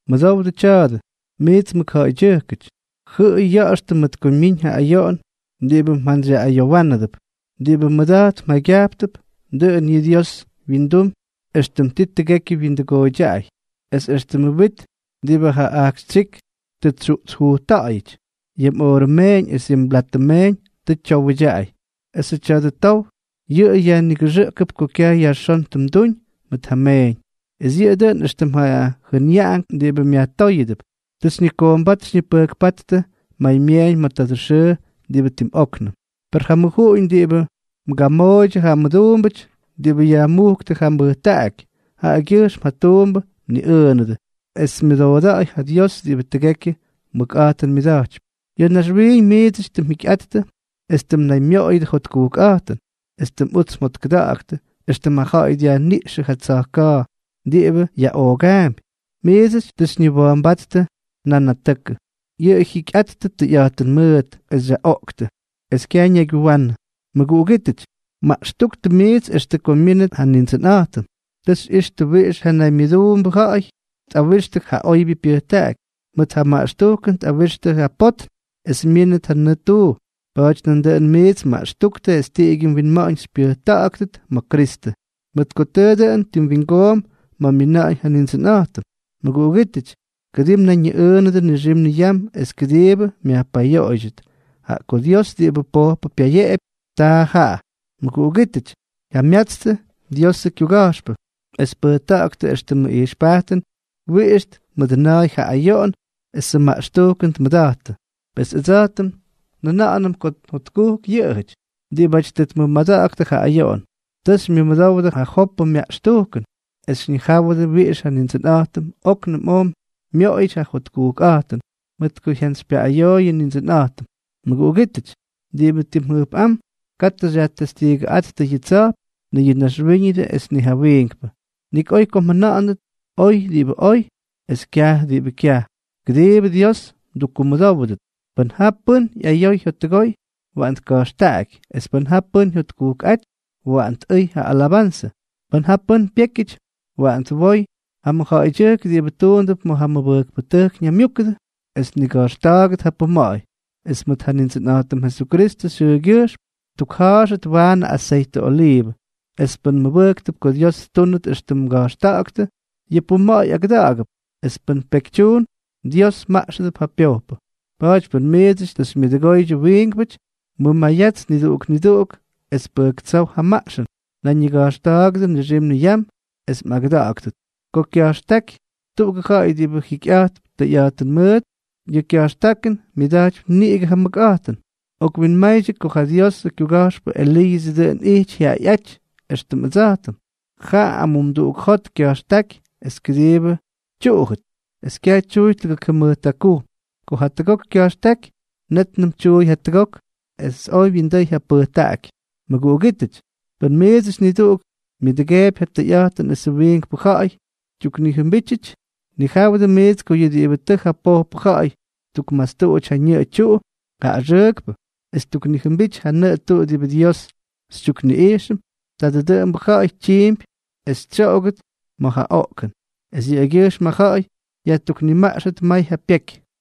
Mʉdowdʉ tya̱a̱dʉ, miits mʉkja̱ꞌa̱ydyʉjkʉty. Jʉꞌʉy ya̱ꞌa̱xtʉ mʉt ko myiñ ja ayoꞌon diꞌibʉ mjantsyyaꞌꞌayowánʉdʉp. Diꞌibʉ mmʉda̱jt mjaygyajptʉp, dʉꞌʉn yʉꞌʉ Dios wyindum éxtʉm ti tʉgekyʉ wyindʉgooydyaꞌay, es éxtʉmʉ wit diꞌibʉ ja ajkxytsyík tʉ tsyuꞌtsjujtta̱ꞌa̱yʉty. Yʉ mꞌoorʉ meeñ es yʉ mblatʉ meeñ tʉ tyowʉdyaꞌay, esʉ tya̱dʉ tow yʉꞌʉ yajnigʉxʉꞌʉgʉp ko kyaj yajxón tʉ mduñ mʉt ja mmeeñ, es yʉꞌʉ dʉꞌʉn éxtʉm ja jʉnyaꞌank diꞌibʉ myajtóyʉdʉp. Tʉ xyñikoombát xyñipʉjkpáttʉ maymyeeñ ma̱ tadʉ xʉʉ diꞌibʉ tim óknʉm. Per ja mʉjuꞌuñ diꞌibʉ mgamooydyʉ ja mduumbʉty diꞌibʉ yajmujktʉ ja mbʉjtaꞌaky, jaꞌagyʉjxm ja tuumbʉ mniꞌʉʉnʉdʉ, es myʉdooda̱a̱y ja Dios diꞌibʉ tʉgekyʉ mʉkꞌa̱jtʉn myʉda̱jtypy. Ya̱ naxwiiñ miidsʉty tʉ mjikyꞌattʉ es tʉ mnaymyoꞌoyʉdʉ jotkujkꞌa̱jtʉn, es tʉ mꞌuts mjotkʉda̱ꞌa̱ktʉ, éxtʉm ja ja̱ꞌa̱y dyajniꞌxʉ ja tsa̱jka̱a̱ diꞌibʉ yaꞌoogaampy. Miidsʉty tʉ xyñiwa̱a̱mbáttʉ nanatʉkʉ. Yʉꞌʉ jyikyꞌattʉ tʉyꞌa̱jtʉn mʉʉt, es xyaꞌoꞌktʉ, es kyaj ñaygyuwanʉ. Mʉguꞌugítʉty, maꞌxtúktʉ miits extʉ ko myínʉt ja Nindsʉnꞌa̱jtʉm. Tʉ xyꞌixtʉ wiꞌix ja naymyʉduunʉbʉ ja̱ꞌa̱y tꞌawixtʉ ja oybyʉ pyʉjtaꞌaky. Mʉt ja maꞌxtujkʉn tꞌawixtʉ ja potn es myínʉt ja nʉʉ tuu. Pa̱a̱ty nandʉꞌʉn miidsʉty maꞌxtúktʉ es tiꞌigyʉ mwinma̱ꞌa̱ñ xypyʉjta̱ꞌa̱ktʉt ma̱ Kristʉ, mʉt ko tʉʉ dʉn tim wingoomp ma̱ myina̱ꞌa̱ñ ja Nindsʉnꞌa̱jtʉm. Mʉguꞌugítʉty, kʉdii mnayñiꞌʉʉnʉdʉ nixim niyam, es kʉdiibʉ myajpayoꞌoydyʉt, jaꞌa ko Dios diꞌibʉ pojpʉ pyayeꞌepy, taa jaꞌa. Mʉguꞌugítʉty, jamyatstʉ Diosʉ kyuga̱jxpʉ es pʉjta̱ꞌa̱ktʉ éxtʉmʉ ijxpajtʉn wiꞌix tmʉdʉna̱a̱y ja ayoꞌon esʉ maꞌxtujkʉn tmʉda̱jttʉ. Pes ʉdsa̱jtʉm njʉna̱ꞌa̱nʉm ko jotkujk yʉꞌʉjʉty diꞌibáty tʉ tmʉmada̱ꞌa̱ktʉ ja ayoꞌon. Tʉ xymyʉdowdʉ ja Jopʉ myaꞌxtujkʉn, es xyñijáwʉdʉ wiꞌix ja Nindsʉnꞌa̱jtʉm óknʉm oj myoꞌoyʉty ja jotkujkꞌa̱jtʉn, mʉt ko jyantsypyaꞌꞌayoy yʉ Nindsʉnꞌa̱jtʉm. Mʉguꞌugítʉty, diꞌibʉ tim jʉjpꞌám, katʉ xyajtestiigʉꞌáttʉ yʉ tsa̱jp, ni yʉ naxwíñʉdʉ es ni ja wiinkpʉ. Nik oy ko mjʉna̱ꞌa̱ndʉt “oy” diꞌibʉ oy, es “kyaj” diꞌibʉ kyaj, kʉdiibʉ Dios mdukkumʉdówʉdʉt. Pʉn ja pʉ́n ꞌyayoy jyottʉgoy, waꞌan tka̱jxtaꞌaky; es pʉn ja pʉ́n jyotkujkꞌáty, waꞌan tꞌʉy ja alabanzʉ. Pʉn ja pʉ́n pyékyʉty, waꞌan twoy ja mʉjja̱ꞌa̱ydyʉjk diꞌibʉ tuundʉp ma̱ mʉbʉjkpʉtʉjk ñaymyúkʉdʉ, es tniga̱jxta̱a̱gʉt ja puma̱ꞌa̱y, es mʉt ja Nindsʉnꞌa̱jtʉm Jesukristʉ xyʉʉgyʉjxm ttukja̱a̱xʉt waanʉ aseytʉ oliivʉ. Es pʉn mmʉbʉjktʉp ko Dios ttúnʉt éxtʉm mga̱jxta̱ꞌa̱ktʉ, yʉ puma̱ꞌa̱y agʉda̱ꞌa̱gʉp; es pʉn pekytyuun, Dios maꞌxʉdʉp ja pyojpʉ. Pa̱a̱ty pʉn miidsʉty tʉ xymyʉdʉgoydyʉ wiinkpʉty, mʉmayats niduꞌuk niduꞌuk, es pʉjktsów ja maꞌxʉn. Nayñiga̱jxta̱a̱gʉdʉ nixim niyam es mꞌagʉda̱ꞌa̱ktʉt. Ko kya̱jxtáky tuꞌugʉ ja̱ꞌa̱y diꞌibʉ jikyꞌa̱jtp tʉyꞌa̱jtʉn mʉʉt, yʉ kya̱jxtákʉn myʉda̱jtypy niꞌigʉ ja mʉkꞌa̱jtʉn. Okwinmaydyʉ ko ja Diosʉ kyuga̱jxpʉ Eliiʉsʉ dʉꞌʉn ijty jyaꞌayꞌáty éxtʉm ʉdsa̱jtʉm. Jaꞌa amumduꞌuk jot kya̱jxtáky es kʉdiibʉ tyuꞌujʉt, es kyaj tyuuy tʉgʉk jʉmʉjt jakujm. Ko jatʉgok kya̱jxtáky, nétnʉm tyuuy jatʉgok, es oj wyindʉy ja pʉjtaꞌaky. Mʉguꞌugítʉty, pʉn miidsʉty niduꞌuk myʉduꞌudʉgeepy ja tʉyꞌa̱jtʉn esʉ wiinkpʉ ja̱ꞌa̱y tyuknijʉmbítyʉty, nijáwʉdʉ miits ko yʉ diꞌibʉ tʉ ja pojpʉ ja̱ꞌa̱y ttukmastuꞌuty ja ñʉꞌʉ tyuꞌu ja axʉʉkpʉ, es ttuknijʉmbity ja nʉꞌʉ tuꞌu diꞌibʉ Dios xytyukniꞌijxʉm, tadʉ dʉꞌʉmbʉ ja̱ꞌa̱y tyiimpy es tsyoꞌogʉt ma̱ ja oꞌkʉn, es yʉꞌʉgyʉjxm ja ja̱ꞌa̱y yajtuknimaꞌxʉt may ja pyeky.